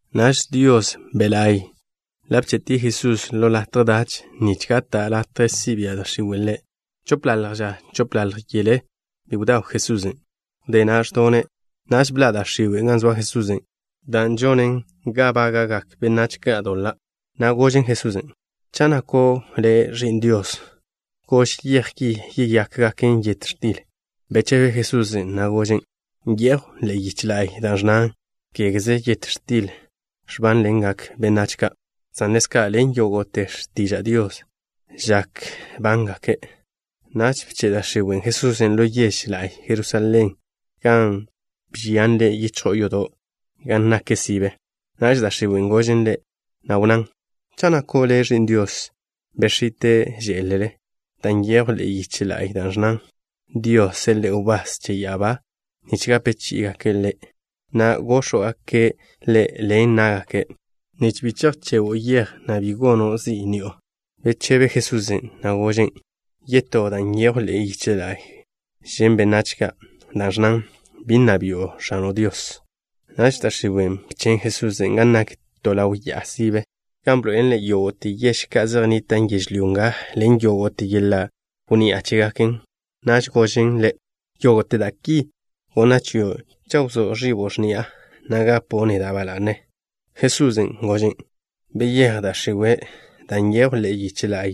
Naž Dios Be' La'y ḻa' bche'tie' Jesusen' ḻo latje dach nich gata' latje si' bia' da' x̱iwe' Ḻe'. Chopḻalj ža chopḻalj yele bi be bdaw Jesusen'. Wdé na' ẕdone'. Naž bḻa' da' x̱iwen' gan zoa Jesusen', dan' žonen ga bága'gak benách ka' doḻa', na' gožen Jesusen': —Cha' nako' Le' Ẕi'n Dios, gož yej ki yeyákgaken yet x̱til. Bechebe Jesusen', na' gožen': —Nyejw ḻe'e yiche la'y da' ẕnnan: “Kégeze yet x̱til ẕbánḻengak benách ka', san ḻezka' ḻen yógo'te x̱tiža' Dios žak bángake'.” Naž bche' da' x̱iwen' Jesusen' ḻo yež la'y Jerusalén, gan bžian Ḻe' yichjo'o yodo' gan nak sibe. Naž da' x̱iwen' gožen Ḻe', na' wnnán: —Cha' nako' Le' Ẕi'n Dios, bex̱ite' žé'lele, dan' nyejw ḻe'e yiche la'y da' ẕnnan: Dios seḻe'e wbás che ya'abá ka' nich gape chí'igake' Le', na' góx̱wgake' Le' ḻen ná'gake', nich bi chejchego' yej, na' bi gono' zi' ni'o. Bechebe Jesusen', na' gožen': —Yetó da' nyejw ḻe'e yiche la'y žen' benách ka', dan' ẕnnan: “Bi nna bi'o X̱ano' Dios.” Naž da' x̱iwen' bchen' Jesusen' gan nak to ḻaw ya'a sibe, gan bḻoe'elen Ḻe' yógo'te yež ka' zej nnitan' yežlyó nga ḻen yógo'te yeḻa' wnni'a chégaken. Naž gožen Ḻe': —Yógo'te da' ki gonna' chio' cha' wzóa ẕibo' x̱ni'a, na' gapo' neda' ba la'ne. Jesusen' gožen': —Beyéj, da' x̱iwe', dan' nyejw ḻe'e yiche la'y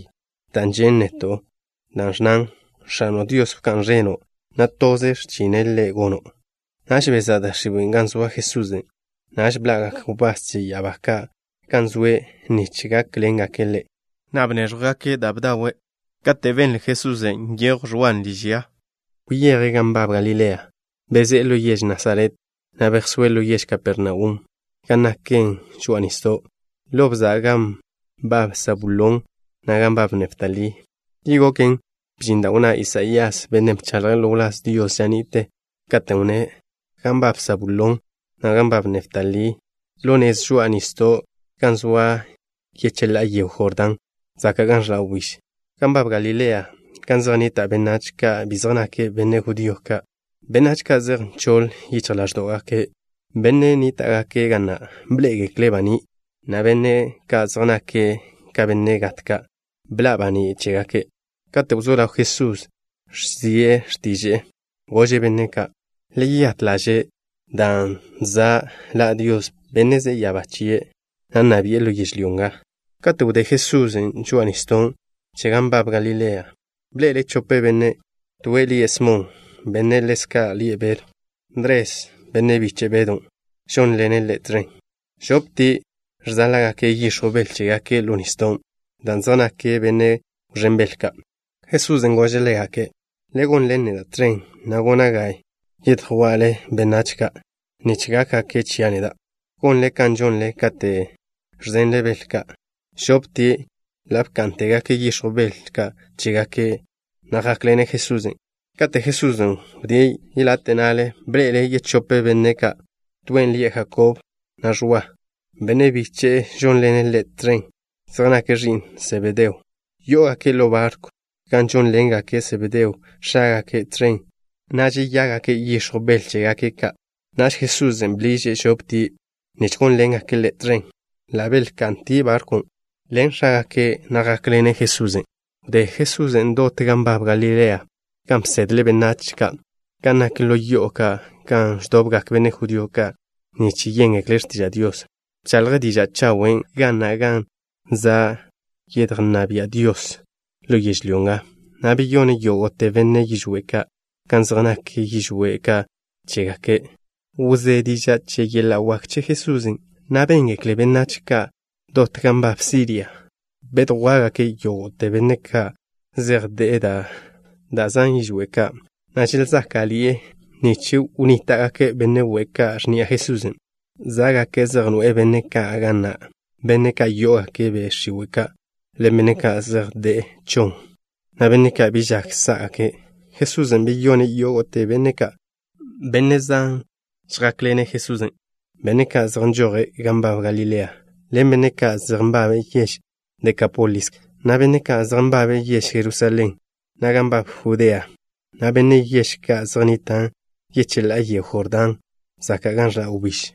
da' žen' neto', dan' ẕnnan: “X̱ano' Dios wká'n ẕeno', na' toze x̱chine' Ḻe' gono'.” Naž bezá' da' x̱iwen' gan zoa Jesusen'. Naž bḻa'gak wbás che ya'abá ka' gan zoe' nich gákḻengake' Ḻe', na' bnéẕjwgake' da' bdawe'. Kate' benle Jesusen' nyejw Ẕwan' liž ya, wyeje' gan nbab Galilea. Bezé'e ḻo yež Nasaret, na' bejsóe' ḻo yež Kapernaum gan naken žoa'a nisdo', ḻo bza' gan nbab Sabulón, na' gan nbab Neftalí. Ki goken, bžin da' wnná Isaías, bennen' bchaḻje' ḻo wláz Dios ža ni'te, katen' wnné': Gan nbab Sabulón, na' gan nbab Neftalí, ḻo nez žoa'a nisdo' gan zoa yecheḻá'a yego Jordán zaka' gan ẕḻa' wbíž, gan nbab Galilea, gan zej nnita' benách ka' bi zej nake' benne' judío ka'. Benách ka' zej nchoḻ yichj ḻáẕdo'gake', benne' nníta'gake' ga na', bḻé'egekle' baní', na' benne' ka' zej nake' ka benne' gat ka', bḻa' baní' chégake'. Katen' wzó ḻaw Jesusen' ẕzie' x̱tiže'e, gože' benne' ka': —Le yeyát ḻaže', dan' za' ḻa' Dios, Bennen' ze'e ya'abá chie', na' nna bi'e ḻo yežlyó nga. Kate' wdé Jesusen' žoa'a nisdo' che gan nbab Galilea, bḻe'ele' chope benne'. Toen' lie' Smon, bennen' ḻezka' lie' Bedw. Ndres, benne' biche' Bedon', žónḻene' ḻe' tẕen. Žoptie' ẕzáḻa'gake' yix̱jw bel chégake' ḻo nisdon', dan' zej nake' benne' wẕén bel ka'. Jesusen' gože' ḻégake': —Le gonḻen neda' tẕen, na' gona' ga yedjwa'le benách ka' nich gákgake' chia' neda', gonle kan žonle kate' ẕzenle bel ka'. Žoptie' ḻa' bká'ntegake' yix̱jw bel ka' chégake', na' jákḻene' Jesusen'. Kate' Jesusen' wdíe' yelate' na'le, bḻe'ele' yechope benne' ka'. Toen' lie' Jakob, na' Ẕwa, benne' biche'e žónḻene' ḻe' tẕen. Zej nake' ẕi'n Sebedeo. Yó'ogake' ḻo barkw, gan žónḻengake' Sebedeo, x̱ágake', tẕen, na' žeyágake' yix̱jw bel chégake' ka'. Naž Jesusen' bḻiže' žoptie' nich gónḻengake' Ḻe' tẕen. Ḻa' belka'ntie' barkwn', ḻen x̱ágaken', na' jákḻene' Jesusen'. Wdé Jesusen' dot gan nbab Galilea, gan bsedle' benách ka' gan nak ḻo yo'o ka' gan ẕdobgak benne' judío ka' nich yéngekle' x̱tiža' Dios. Bchaḻje' diža' chawen' ga na' kan za' yedjnná bia' Dios ḻo yežlyó nga, na' beyone' yógo'te benne' yižwé' ka' kan zej nak yižwé' ka' chégake'. Wzé diža' che yeḻa' wak che Jesusen', na' béngekle benách ka' dot gan nbab Siria. Bedjwá'gake' yógo'te benne' ka' zej de'e da' zan yižwé' ka', na' želzáka'ḻi'e, nich wnníta'gake' benne' we' ka' x̱ni'a Jesusen'. Zá'gake' zej noe'e benne' ka' ga na', benne' ka' yó'ogake' be' x̱iwe' ka', ḻen benne' ka' zej de'e chon, na' benne' ka' bi žak sá'gake'. Jesusen' beyone' yógo'te benne' ka'. Benne' zan žjákḻene' Jesusen', benne' ka' zej nžoje' gan nbab Galilea, ḻen benne' ka' zej nbabe' yež Dekápolis ka', na' benne' ka' zej nbabe' yež Jerusalén, na' gan nbab Judea, na' benne' yež ka' zej nnitan' yecheḻá'a yego Jordán zaka' gan ẕḻa' wbíž.